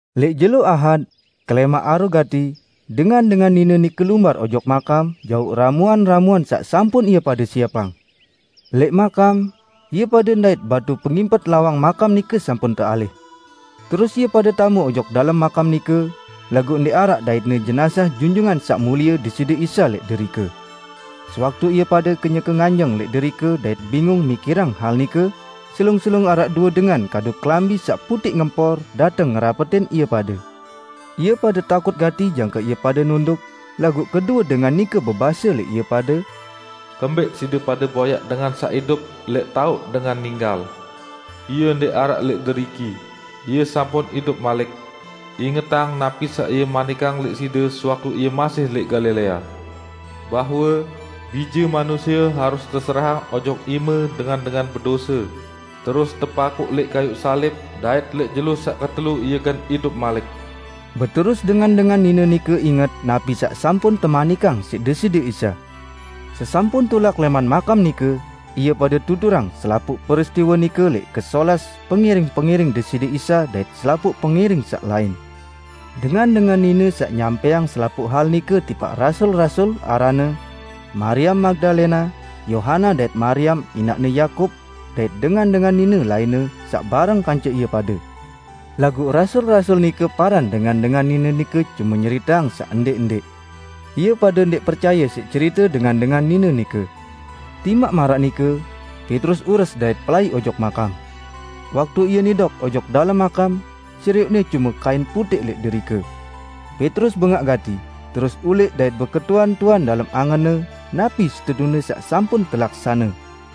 Lẽq jelo Ahad, kelẽmaq aru gati, dengan-dengan nine nike lumbar ojok makam jauq ramuan-ramuan saq sampun ie pade siepang. Lẽq makam, ie pade ndait batu pengimpet lawang makam nike sampun tealih. Terus ie pade tame ojok dalem makam nike, laguq ndẽq araq daitne jenazah Junjungan Saq Mulie Deside Isa lẽq derike. Sewaktu ie pade kenyeke nganjeng lẽq derike dait bingung mikirang hal nike, selung-selung araq due dengan kadu kelambi saq putẽq ngempor dateng ngerapetin ie pade. Ie pade takut gati jangke ie pade nunduk, laguq kedue dengan nike bebase lẽq ie pade, "Kembẽq side pade boyaq dengan saq idup lẽq taoq dengan ninggal? Ie ndẽq araq lẽq deriki, Ie sampun idup malik! Ingetang napi saq Ie manikang lẽq side sewaktu Ie masih lẽq Galilea, bahwe, 'Bije Manusie harus teserahang ojok ime dengan-dengan bedose, terus tepakuq lẽq kayuq salib, dait lẽq jelo saq ketelu Ie gen idup malik.' " Beterus dengan-dengan nine nike inget napi saq sampun temanikang siq Deside Isa. Sesampun tulak lẽman makam nike, ie pade tuturang selapuq peristiwe nike lẽq kesolas pengiring-pengiring Deside Isa dait selapuq pengiring saq lain. Dengan-dengan nine saq nyampẽang selapuq hal nike tipaq rasul-rasul aranne: Mariam Magdalena, Yohana dait Mariam inaqne Yakub dait dengan-dengan nine lainne saq bareng kance ie pade. Laguq rasul-rasul nike paran dengan-dengan nine nike cume nyeriteang saq ndẽq-ndẽq. Ie pade ndẽq percaye siq cerite dengan-dengan nine nike. Timaq maraq nike, Petrus ures dait pelai ojok makam. Waktu ie nidok ojok dalem makam, serioqne cume kain putẽq lẽq derike. Petrus bengaq gati, terus ulẽq dait beketuan-tuan dalem angenne napi setetune saq sampun telaksane.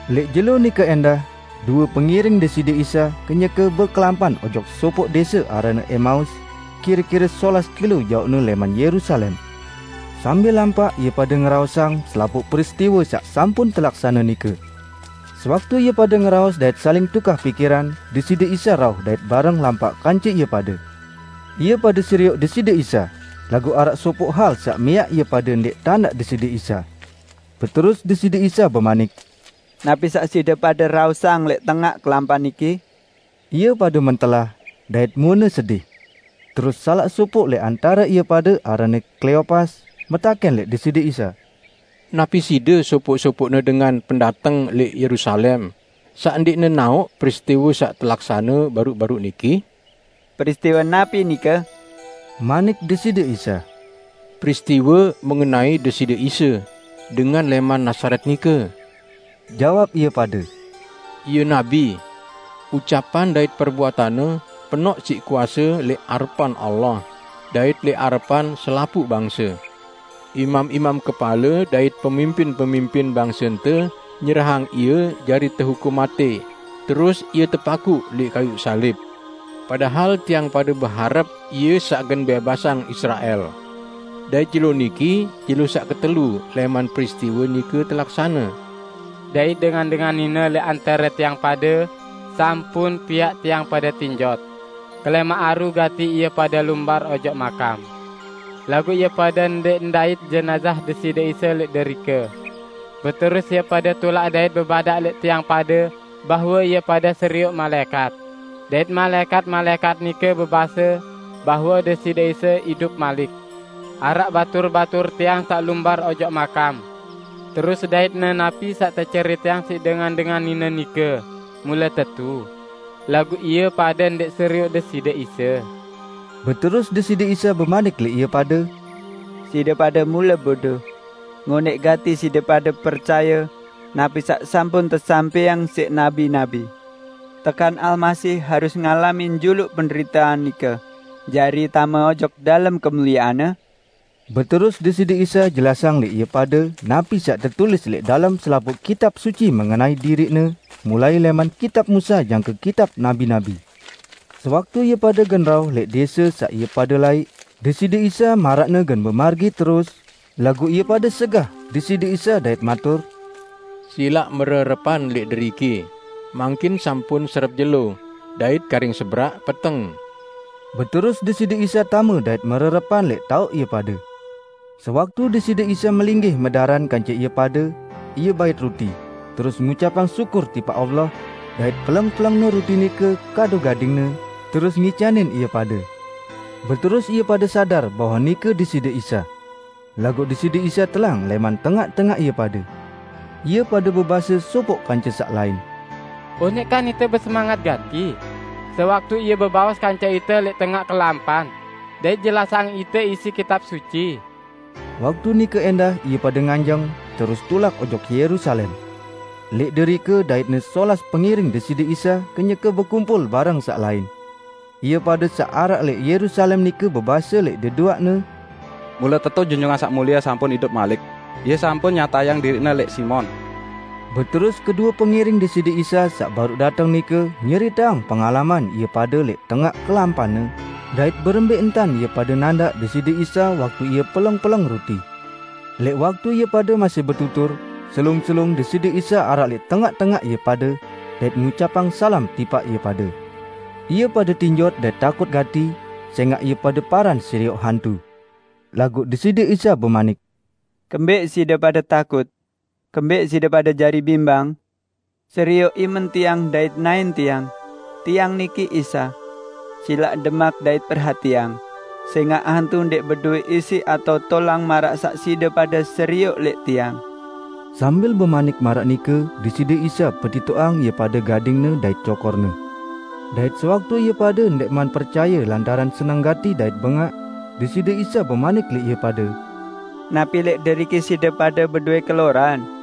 Lẽq jelo nike ẽndah, due pengiring Deside Isa kenyeke bekelampan ojok sopoq dẽse aranne Emaus, kire-kire solas kilo jaoqne lẽman Yerusalem. Sambil lampaq ie pade ngeraosang selapuq peristiwe saq sampun telaksane nike. Sewaktu ie pade ngeraos dait saling tukah pikiran, Deside Isa rauh dait bareng lampaq kance ie pade. Ie pade serioq Deside Isa, laguq araq sopoq hal saq miaq ie pade ndẽq tandaq Deside Isa. Beterus Deside Isa bemanik, "Napi saq side pade raosang lẽq tengaq kelampan niki?" Ie pade mentelah, dait muene sedih. Terus salaq sopoq lẽq antare ie pade aranne Kleopas, metakẽn lẽq Deside Isa, "Napi Side sopoq-sopoqne dengan pendateng lẽq Yerusalem, saq ndẽq nenaoq peristiwe saq telaksane baruq-baruq niki?" "Peristiwe napi nike?" manik Deside Isa. "Peristiwe mengenai Deside Isa, dengan lẽman Nazaret nike," jawab ie pade. "Ie nabi. Ucapan dait perbuatan-Ne penoq siq kuase lẽq arepan Allah, dait lẽq arepan selapuq bangse. Imam-imam kepale dait pemimpin-pemimpin bangsente nyerahang Ie jari tehukum matẽ, terus Ie tepakuq lẽq kayuq salib! Padahal tiang pade beharep Ie saq gen bẽbasang Israel! Dait jelo niki jelo saq ketelu lẽman peristiwe nike telaksane. Dait dengan-dengan nine lẽq antare tiang pade sampun piaq tiang pade tinjot: Kelẽmaq aru gati ie pade lumbar ojok makam, laguq ie pade ndẽq ndait jenazah Deside Isa lẽq derike. Beterus ie pade tulak dait bebadaq lẽq tiang pade bahwe ie pade serioq malaẽkat, dait malaẽkat-malaẽkat nike bebase bahwe Deside Isa idup malik. Araq batur-batur tiang saq lumbar ojok makam, terus daitne napi saq teceriteang siq dengan-dengan nine nike mule tetu, laguq ie pade ndẽq serioq Deside Isa." Beterus Deside Isa bemanik lẽq ie pade, "Side pade mule bodo! Ngonẽq gati side pade percaye napi saq sampun tesampẽang siq nabi-nabi! Tekan Almasih harus ngalamin juluq penderitean nike, jari tame ojok dalem kemuliean-Ne?" Beterus Deside Isa jelasang lẽq ie pade napi saq tetulis lẽq dalem selapuq Kitab Suci mengenai diriq-Ne, mulai lẽman kitab Musa jangke kitab nabi-nabi. Sewaktu ie pade gen rauh lẽq dẽse saq ie pade laiq, Deside Isa maraqne gen bemargi terus, laguq ie pade segah Deside Isa dait matur, "Silaq mererepan lẽq deriki, mangkin sampun serep jelo, dait karing seberaq peteng." Beterus Deside Isa tame dait mererepan lẽq taoq ie pade. Sewaktu Deside Isa melinggih medaran kance ie pade, Ie bait ruti, terus ngucapang syukur tipaq Allah, dait peleng-peleng-Ne ruti nike kadu gading-Ne, terus ngicanin ie pade. Beterus ie pade sadar bahwe nike Deside Isa. Laguq Deside Isa telang lẽman tengaq-tengaq ie pade. Ie pade bebase sopoq kance saq lain, "Onẽq kan ite besemanget gati, sewaktu Ie bebaos kance ite lẽq tengaq kelampan, dait jelasang ite isi Kitab Suci?" Waktu nike ẽndah ie pade nganjeng terus tulak ojok Yerusalem. Lẽq derike daitne solas pengiring Deside Isa kenyeke bekumpul bareng saq lain. Ie pade saq araq lẽq Yerusalem nike bebase lẽq deduaqne, "Mule tetu Junjungan Saq Mulie sampun idup malik! Ie sampun nyatayang diriq-Ne lẽq Simon!" Beterus kedue pengiring Deside Isa saq baruq dateng nike nyeriteang pengalaman ie pade lẽq tengaq kelampanne, dait berembẽ entan ie pade nandaq Deside Isa waktu Ie peleng-peleng ruti. Lẽq waktu ie pade masih betutur, selung-selung Deside Isa araq lẽq tengaq-tengaq ie pade, dait ngucapang salam tipaq ie pade. Ie pade tinjot dait takut gati, sẽngaq ie pade paran serioq hantu. Laguq Deside Isa bemanik, "Kembẽq side pade takut? Kembẽq side pade jari bimbang? Serioq imen Tiang dait naẽn Tiang. Tiang niki Isa. Silaq demak dait perhatiang, sẽngaq hantu ndẽq bedowẽ isi atao tolang maraq saq side pade serioq lẽq Tiang." Sambil bemanik maraq nike Deside Isa petitoqang ie pade gading-Ne dait cokor-Ne. Dait sewaktu ie pade ndẽqman percaye lantaran seneng gati dait bengaq, Deside Isa bemanik lẽq ie pade, "Napi lẽq deriki side pade bedowẽ keloran?"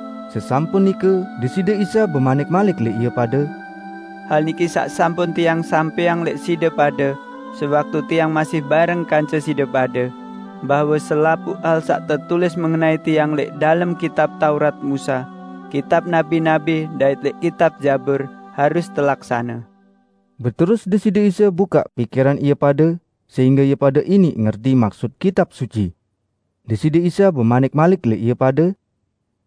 Sesampun nike, Deside Isa bemanik malik lẽq ie pade, "Hal niki saq sampun Tiang sampẽang lẽq side pade sewaktu Tiang masih bareng kance side pade: Bahwe selapuq hal saq tetulis mengenai Tiang lẽq dalem Kitab Taurat Musa, Kitab Nabi-nabi dait lẽq Kitab Zabur, harus telaksane." Beterus Deside Isa bukaq pikiran ie pade, sehingge ie pade iniq ngerti maksut Kitab Suci. Deside Isa bemanik malik lẽq ie pade,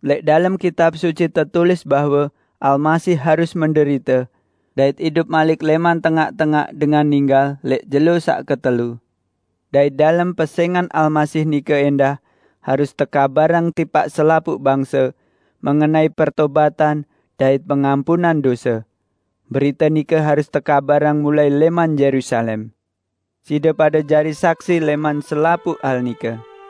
"Lẽq dalem Kitab Suci tetulis bahwe Almasih harus menderite, dait idup malik lẽman tengaq-tengaq dengan ninggal lẽq jelo saq ketelu. Dait dalem pesẽngan Almasih nike ẽndah harus tekabarang tipaq selapuq bangse mengenai pertobatan dait pengampunan dose. Berite nike harus tekabarang mulai lẽman Yerusalem. Side pade jari saksi lẽman selapuq hal nike.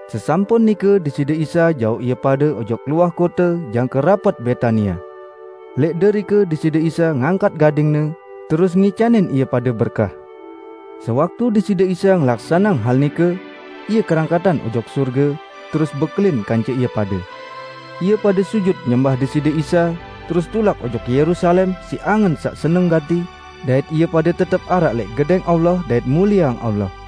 Sesampun nike Deside Isa jauq ie pade ojok luah kote jangke rapet Betania. Lẽq derike Deside Isa ngangkat gading-Ne, terus ngicanin ie pade berkah. Sewaktu Deside Isa ngelaksaneang hal nike, Ie kerangkatan ojok sorge, terus bekelin kance ie pade. Ie pade sujut nyembah Deside Isa, terus tulak ojok Yerusalem siq angen saq seneng gati, dait ie pade tetep araq lẽq Gedẽng Allah dait mulieang Allah.